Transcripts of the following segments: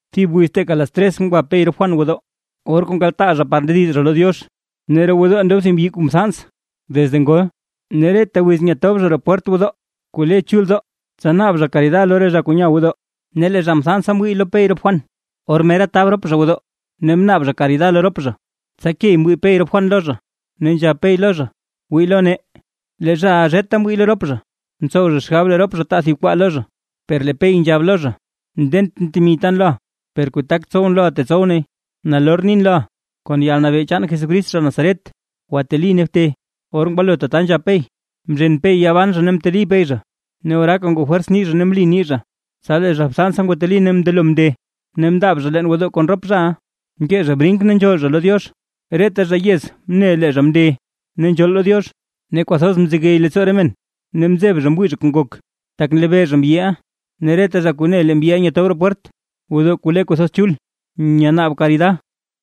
Thib wiz teeka las tres ngwa Pey rop Juan gwodoo, or kuu nkaltaa zha par ndediz zha lo Diox. Ne roo gwodoo ndob thib mbyi kuu mthans desde ngol, ne reta wiz nyatob zha zha roo pwert gwodoo kuu le chuldoo, tsa naab zha karida lo re zha kuu nya gwodoo. Ne lee zha mthansa mwii lo Pey rop Juan, or mera tab rop zha gwodoo, ne mnaab zha karida lo rop zha. Tsa key mwii Pey rop Juan lo zha, ne nzhab Pey lo zha: ―Wii lo nee. Lee zhaʼa zheta mwii lo rop zha, mtsow zha xgab lee rop zha taa thib kwaa lo zha. Per lee Pey nzhab lo zha: ―Ndentʼn temi tan loʼa, per kuu tak tsowʼn loʼa tetsow nay. Nalor nin loʼa: “Kon yalnabee chaan Jesucrist zha Nazaret, gwateli ne bte”. Or ngwalo tata nzhab Pey, mzhen Pey yaa ban zha ne mteli Pey zha, ne oraaka ngoo fwers nii zha ne mli nii zha. Tsa lee zha mthansa ngwateli ne mndelo mnde, ne mndaab zha leen gwodoo kon rop zhaʼa. Nkee zha brink ne nzhool zha lo Diox. Reta zha yez mne lee zha mnde ne nzhool lo Diox, ne kwathoz mzegey leettsoo re men ne mzeb zha mwii zha kuu ngok, tak nlebee zha mbyiʼa, ne reta zha ne lee mbyiʼa nyatob roo pwert gwodoo kuu le kwathoz chul, nyanaab karida.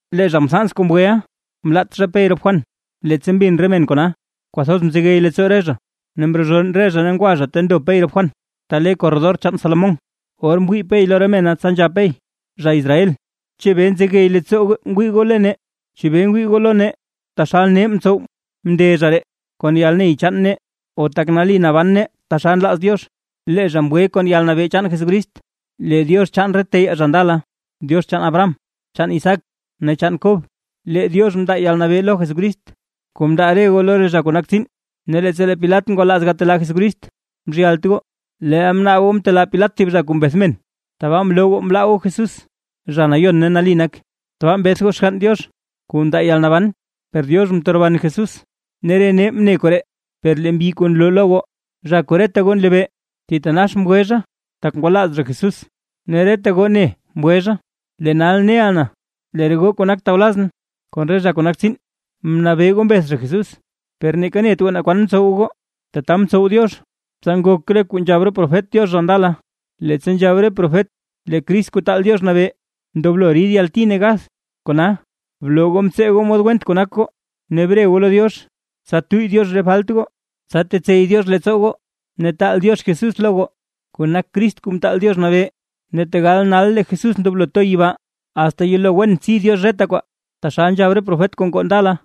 Lee zha mthans kuu mgweʼa, mlaat zha Pey rop Juan. Leettsa mbin re men kona, kwathoz mzegey leettsoo re zha ne mrozhonn re zha ngwa zha ta ndo Pey rop Juan, ta le korredor chaan Salomón. Or mwii Pey lo re mena, tsa nzhab Pey: ―Zha Israel, ¿chebee nzegey leettsoo goo ngwii goo lo nee? ¿Chebee ngwii goo lo nee taxal nee mtsow mnde zha ree kon yalney chaan nee, o tak nali naban nee taxal nlaaz Diox, lee zha mgwe kon yalnabee chaan Jesucrist? Lee Diox chaan re teyaa zha ndala, Diox chaan Abraham, chaan Isaac ne chaan Kob, lee Diox mndaa yalnabee lo Jesucrist kuu mndaa re goo lo re zha kuu nak tsiin. Ne leettsa lee Pilat ngwalaaz gatelaa Jesucrist mzhyalt goo. Leel mnaab goo mtelaa Pilat thib zha kuu mbeth men, tabaa mloo goo mlaa goo Jesús zha Nayon ne Nali nak. Tbaa mbeth goo Xgann Diox, kuu ndaa yalnaban, per Diox mteroban Jesús, ne re nee mne koree. Per lee mbyi kuu nloo lo goo, zha kuu reta goo nlebee, thitanax mgwe zha, tak ngwalaaz zha Jesús, ne reta goo ne mgwe zha. ’Lee nal neʼa na, lee re goo kuu nak tawlazʼn kon re zha kuu nak tsiin, mnabee goo mbeth zha Jesús, per neeka net goo naa kwan mtsow goo. Tata mtsow Diox, tsa ngok kuu nzhab re profet Diox zha ndala: Leettsa nzhab re profet lee Crist Kuu Taal Diox Nabee, ndoblo rid yalti ne gath. Kona, bloo goo mtsee goo mod went kuu nak goo, ne bre goo lo Diox, tsa tuyy Diox re falt goo. Tsa tetsey Diox leettsoo goo, ne taal Diox Jesús lo goo, kuu nak Crist Kuu Mtaal Diox Nabee. Ne tegal nal lee Jesús ndoblo to yibaa, asta yelo wen tsi Diox reta kwaa, taxal nzhab re profet kuu ngoo ndala.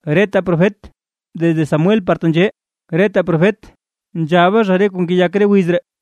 ’Reta profet desde Samuel par tenzhee, reta profet nzhaba zha re kuu ngeyak re wiz ree.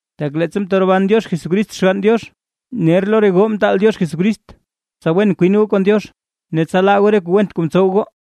Tak leettsa mteroban Diox Jesucrist Xgann Diox, ner lo re goo mtaal Diox Jesucrist, tsa wen kwin goo kon Diox, ne tsa laa goo re kuu went kuu ntsow goo.